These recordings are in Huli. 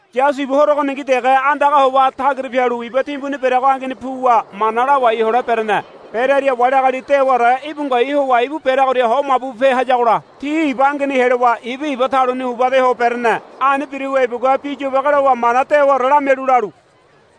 Yasu ibu horo ogoningi dege andaga howa tagira pialu iba timbuni bereago angeni puwa mana lawai hole berene. Berearia wali agali dewaore íbu ngoai howa ibu bereagoria ho mabu bupe hayagola ti iba angeni helowa ibu iba taluni uba ede ho berene. Ani biruwa ibugua bi yobage lowa mana dewaore lamialu lalu,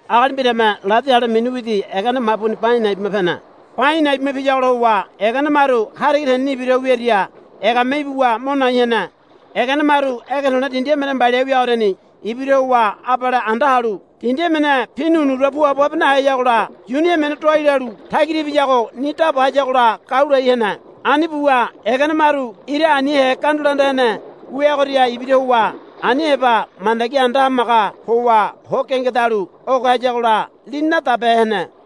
Agali mbirame ladi ale mini widi egene mabuni ba a̱i̱ na̱i̱ bima pene. Ba a̱i̱ na̱i̱ bima piyagola howa egene maru hariga teneni ibira ho wiaria egame ibuwa mo nai hene. Egene maru ege to̱le̱ dindi emene mbaliahe wiagoriani ibira howa abale anda halu dindi emene pini unura puabo habe naheyagola yuni emene doai lalu tagira ibiyago ni daba hayagola gau lai hene. Ani buwa egene maru ira anihe gandula anda hene wiagoria ibira howa ani heba mandagi anda hamaga howa ho gengedalu oge hayagola lini nadabehe hene.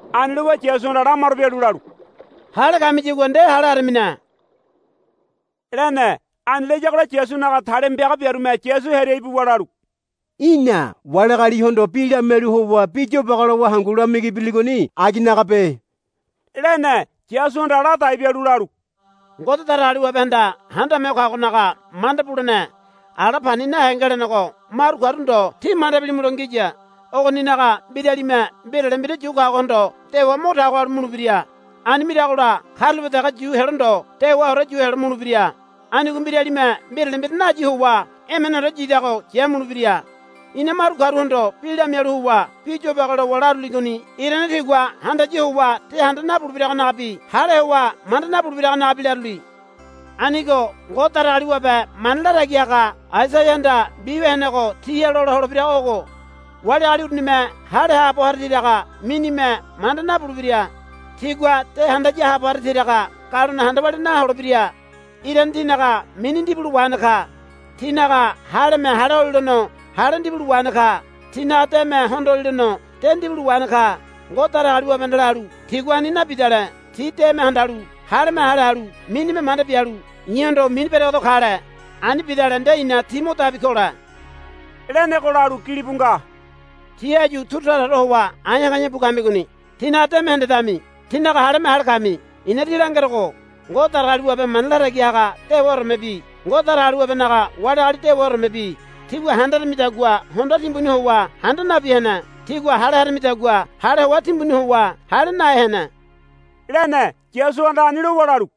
Ani lowa Yasuhanda lamaro bialu lalu, Hale kamiyagua nde hale haramine, lene. Ani layagola Yasunaga talima piaga biarume Yasu hearia ibuwa lalu, Í̠na wali agalihondo bi lamialu howa bi yobage lowa hangu lamigi biriligoni aginagabe, lene. Yasuhanda ladai bialu lalu, Ngode Datagaliwabehanda Handame Ho Kagonaga manda bulene ala pani nahe ngelenego maru karu ndo tí manda bilimulo ngiya. Ogoninaga mbiralime mbirale mbira yu kagohondo dewa mo tago halu mulebira. Ani miragola karulape dege yu helo ndo dewaore yu helo mulebira. Anigo mbiralime mbirale mbira nayi howa emeneore yidago yamulebira. I̱na maru karuhondo bi lamialu howa bi yobage lowa laruligoni irane tigua handaya howa de handa nabulebiragonagabi hale howa manda nabulebiragonagabi laruli. Anigo Ngode Datagaliwabe mana latagi haga Aisaiahanda mbiwia henego tiha lola holebirago ogo, Wali agali urunime hale haabo hara tiraga minime manda nabulebira. Tigua de handaya haabo hara tiraga galone handa walia naholebira. Irane tinaga mini ndibulo wahene ka. Tinaga haleme hale holilono hale ndibulo wahene ka. Tinaga deme hondolilono de ndibulo wahene ka. Ngode Datagaliwabehanda lalu, Tigua ani nabidale ti deme handalu haleme hale halu minime manda bialu i̱hondo mini beregedo kale. Ani bidale nde i̱na ti mo dabi kole, lenego, lalu gilibu nga. Tí áyu turu taraore howa a̱e̱a̱ ka̱e̱a̱ bu kamigoni. Tínaga deme hendedami. Tínaga haleme hale kami. I̱na tí langerogo Ngode Datagaliwabe mana latagi haga dewaoremebi Ngode Datagaliwabenaga wali agali dewaoremebi tígua handaramidagua hondoa timbuni howa handa nabi hene. Tígua hale haramidagua hale hoa timbuni howa hale nahe hene, lene. Yasuhanda ani lowa lalu,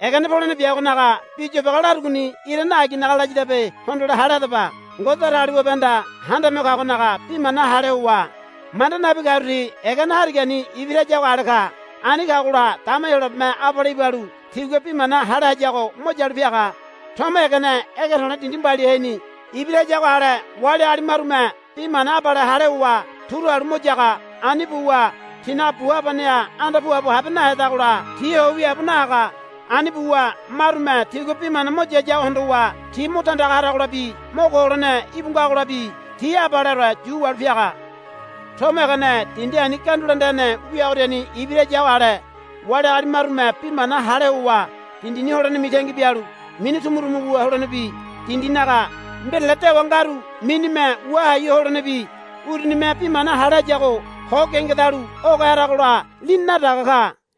Egene polene biagonaga bi yobage larugoni irane aginaga layadabe hondole hale hadaba. Ngode Datagaliwabehanda Handame Ho Kagonaga bi mana hale howa manda nabi karu ti egene harigani ibira hayago ale ka. Ani kagola dama Heyolabeme abale ibalu tigua bi mana hale hayago mo yalu piaga. Tomo egene ege to̱le̱ dindi mbaliaheni ibira hayago ale wali agali marume bi mana abale hale howa turu halu mo yaga. Ani buwa tinaga bu habaneha anda puabo habe nahedagola ti ho wiaabo nahaga. Ani buwa marume tigua bi mana mo yayago hondowa ti mo tandaga haragolabi mo ko holene íbu ngagolabi ti abaleore yu wahalu piaga. Tomo egene dindi ani gandula anda hene wiagoriani ibira hayago ale wali agali marume bi mana hale howa dindini holene mitangi bialu mini tumutumu wu holenebi dindinaga mbirale dewa ngaru minime wua hai ho holenebi urunime bi mana hale hayago ho gengedalu oge haragola lini nadaga ka.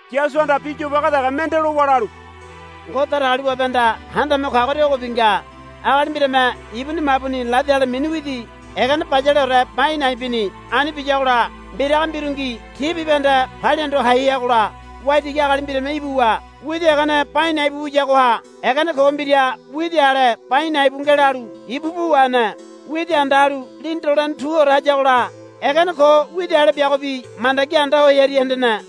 Yasuhanda bi yobage dege mende lowa lalu, Ngode Datagaliwabehanda Handame Ho Kagoria ogobi nga. Agali mbirame ibuni mabuni ladi ale mini widi egene bayaleore ba a̱i̱ na̱i̱ bini. Ani biyagola mbiraga mbirungi ti bibahende palia hondo hai heagola waitigi agali mbirame ibuwa widi egene ba a̱i̱ na̱i̱ bu wiyagoha egene ko mbira widi ale ba a̱i̱ na̱i̱ bu ngelalu ibu pu wahene. Widi anda halu lini dolene tuore hayagola egene ko widi ale biagobi mandagi anda ho hearia hendene.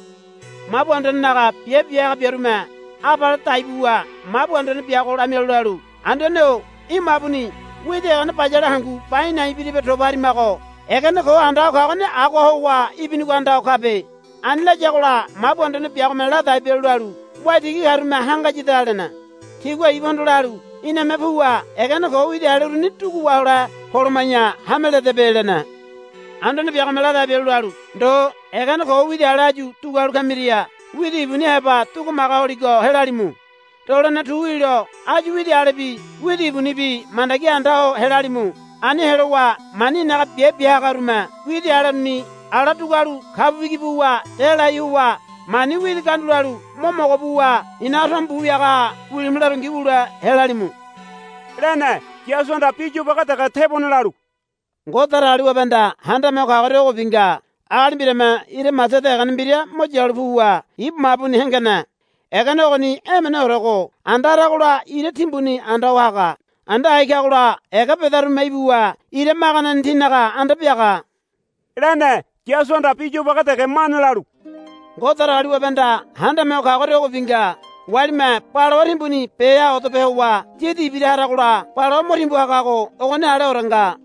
Mabu anduanenaga biabe bia haga biarume abale dai buwa mabu anduane biago lamialu lalu, Anduane-o í̠ mabuni widi egene bayale hangu ba a̱i̱ na̱i̱ biribe toba harimago. Egene ko anda ho kagoni agoha howa ibinigo anda ho kabe. Ani layagola mabu anduane biagome ladai bialu lalu, Waitigi karume hangayada, lene. Tigua ibuhondo lalu, Iname puwa egene ko widi ale uruni dugu wahole poloma̱ya hame ledebe, lene. Anduane biagome ladai bialu lalu, Ndo egene ko widi ale áyu dugualu kamiria widi ibuni heba dugumaga holigo helalimu. Dolene tu wilo áyu widi alebi widi ibunibi mandagi ani anda ho helalimu. Ani helowa mani i̱naga biabe bia hagarume widi ale uruni ala dugualu kabu bigi buwa delai howa mani widi gandulalu mo mogo buwa i̱naga tomo bu wiagaha wilimu larongi wule helalimu, lene. Yasuhanda bi yobage dege tebone lalu, Ngode Datagaliwabehanda Handame Ho Kagoria ogobi nga. Agali mbirame ira masada egene mbira mo yalu puwa ibu mabuni hengene. Egene ogoni emeneorego anda haragola ira timbuni anda ho haga. Anda hai kagola ega bedarume ibuwa ira maganeni tinaga anda biaga, lene. Yasuhanda bi yobage dege mane lalu, Ngode Datagaliwabehanda Handame Ho Kagoria ogobi nga. Walime balawa timbuni beha odape howa yidi ibira haragola balawa mo timbu hagago ogoni aleore nga,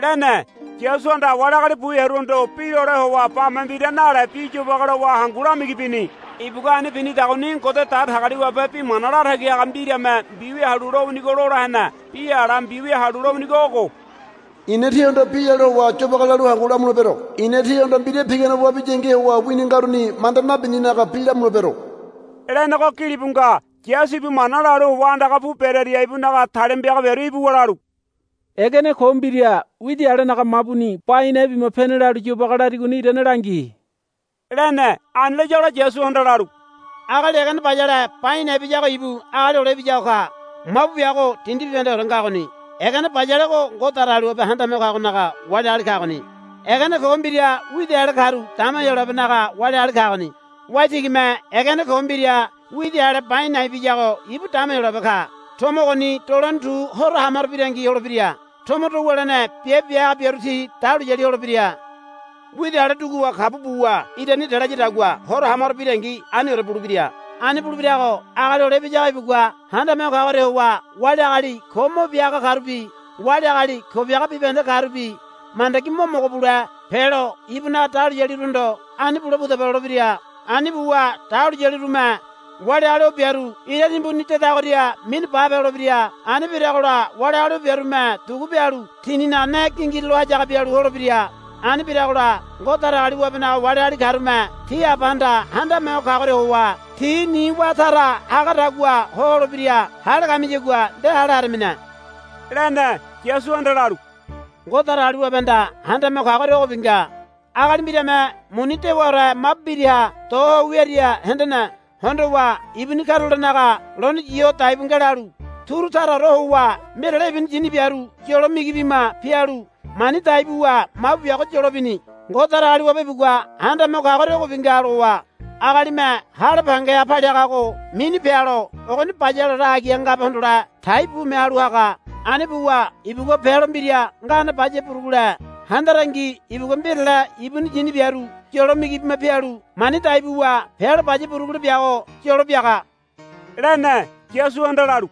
lene. Yasuhanda wali agali bu hearuhondo bi lole howa bame mbira nale bi yobage lowa hangu lamigi bini. Ibugua ani binidagoni Ngode Datagaliwabe bi mana latagi haga mbirame mbiwia halu lowinigo lola hene. Bi ala mbiwia halu lowinigo ogo, I̱na tihondo bi lalu howa yobage lalu hangu lamulebero. I̱na tihondo mbira pigane wabiyangi howa wini ngaruni manda nabininaga bi lamulebero, lenego gilibu nga. Yasu ibu mana lalu howa andaga pu berearia ibunaga talima piaga biaru ibuwa lalu, Egene ko mbira widi alenaga mabuni ba a̱i̱ na̱i̱ bima pene lalu yobage larigoni irane langi, lene. Ani layagola Yasuhanda lalu, Agali egene bayale ba a̱i̱ na̱i̱ biyago ibu Agali Hole Ibiyago ka. Mabu biago dindi bibahendeore ngagoni. Egene bayalego Ngode Datagaliwabe Handame Ho Kagonaga wali agali kagoni. Egene ko mbira widi ale karu dama Heyolabenaga wali agali kagoni. Waitigime egene ko mbira widi ale ba a̱i̱ na̱i̱ biyago ibu dama Heyolabe ka. Tomo ogoni dolene tu horo ha maro birangi holebira. Tomo do wulene biabe bia haga biaru ti dahuliyali holebira. Widi ale duguwa kabu buwa irani delayadagua horo ha maro birangi aniore bulebira. Ani bulebirago Agali Hole Ibiyago ibugua Handame Ho Kagoria howa wali agali ko mo bia haga karubi wali agali ko biaga bibahende karubi mandagi mo mogo bule pelo ibunaga dahuliyaliruhondo, Ani bule pudaba, lolebira. Ani buwa dahuliyalirume wali agali o biaru ira timbuni dedagoria minu bape holebira. Ani biragola wali agali o biarume dugu bialu tininaga ne gingirulo hayaga bialu holebira. Ani biragola Ngode Datagaliwabenaga wali agali karume ti Abahanda Handame Ho Kagoria howa ti ni wá tara hagadagua ho holebira. Hale kamiyagua nde hale haramine, lene. Yasuhanda lalu, Ngode Datagaliwabehanda Handame Ho Kagoria ogobi nga. Agali mbirame muni dewaore mabu mbiraha do ho wiaria hendene. Hondowa ibuni karulolenaga lone yi ho dai bu ngelalu turu taraore howa mbirale ibuni yini biaru yolo migi bima pialu mani dai buwa mabu biago yolo bini. Ngode Datagaliwabe ibugua Handame Ho Kagoria ogobi nga, lowa, Agalime hale pangeha paliagago mini pealo ogoni bayaleore agiha ngabe hondole tai bume halu haga. Ani buwa ibugua pealo mbira ngane baya burugule handarangi ibugua mbirale ibuni yini biaru yolo migi bima pialu mani dai buwa pealo baya burugule biago yolo biaga, lene. Yasuhanda lalu,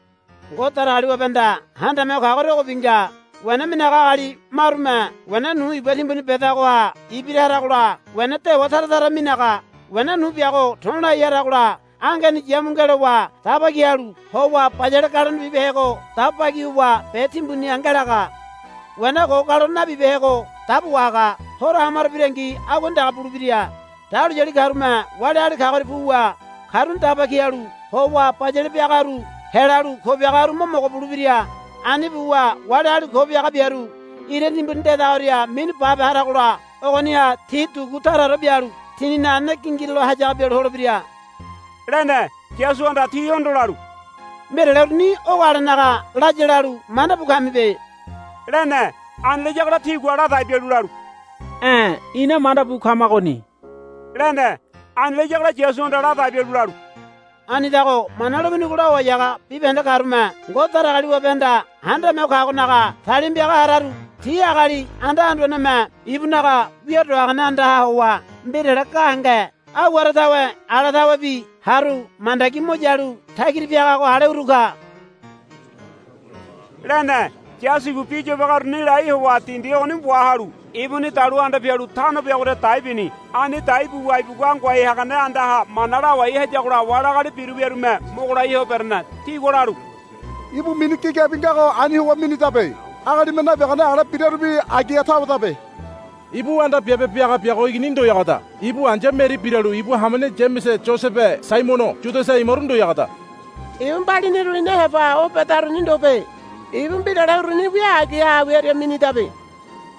Ngode Datagaliwabehanda Handame Ho Kagoria ogobi nga. Wena minaga agali marume wena nu iba timbuni bedagoha ibira haragola wena dewa tara tara minaga. Wena nu biago to̱lai haragola angeni yamu ngelowa daba ki halu howa bayale galone bibehego dabo bagi howa be timbuniha ngelaga. Wena ko galone nabibehego dabo wahaga. Horo ha maro birangi aguani dege bulebira. Dahuliyali karume wali agali kagoria puwa karuni daba ki halu howa bayale biagaru helalu ko biagaru mo mogo bulebira. Ani buwa wali agali ko biaga biaru ira timbuni dedagoria minu bape haragola ogoniha ti dugu taraore bialu tininaga ne gingirulo hayaga bialu holebira, lene. Yasuhanda tihondo lalu, Mbirale uruni ogo alenaga laya lalu manda bu kamibe, lene. Ani layagola tigua ladai bialu lalu, E̱ ina manda bu kamagoni, lene. Ani layagola Yasuhanda ladai bialu lalu, Anidago Mana lowinigo lawai haga bibahende karume Ngode Datagaliwabehanda Handame Ho Kagonaga talima piaga hararu ti agali anda anduaneme ibunaga wia do hagane andaha howa mbirale gahenge aiware tawe ala tawebi haru mandagi mo yalu tagira piagago ale uru ka, lene. Yasu ibu bi yobage uruni lai howa dindi ogoni wahalu ibuni dalu anda pialu tano biagoria dai bini. Ani dai buwa ibugua ngoai hagane andaha mana lawai hayagola wali agali biru wiarume mogo lai ho berene. Tigua lalu, Ibu mini gigabi ngago ani howa minidabe. Agalime nabiagane ale birarubi agiha tawedabe. Ibu anda biabe biaga biago igini ndoyagoda. Ibu ai̱ya Meri biralu ibu hamene Yamese Yosebe Saimono Yudasa imaru ndoyagoda. Ibu mbaliniru ina heba o bedaruni ndobe. Ibu mbirale uruni wia agiha wiaria minidabe,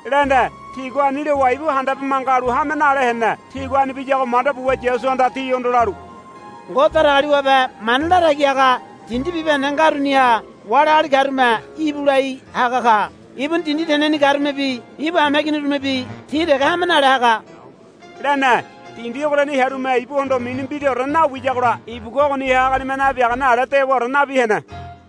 lene. Tigua ani lowa ibu handabe manga halu hame nale hene. Tigua ani biyago manda buwa Yasuhanda tihondo lalu, Ngode Datagaliwabe mana latagi haga dindi bibahende ngaruniha wali agali karume íbu lai haga ka. Ibuni dindi teneni karumebi ibu hameiginirumebi ti dege hame nale haga, lene. Dindi ogoriani hearume ibuhondo mini mbiraore nawiyagola ibugua ogoniha agalime nabiagane ale dewaore nabi hene.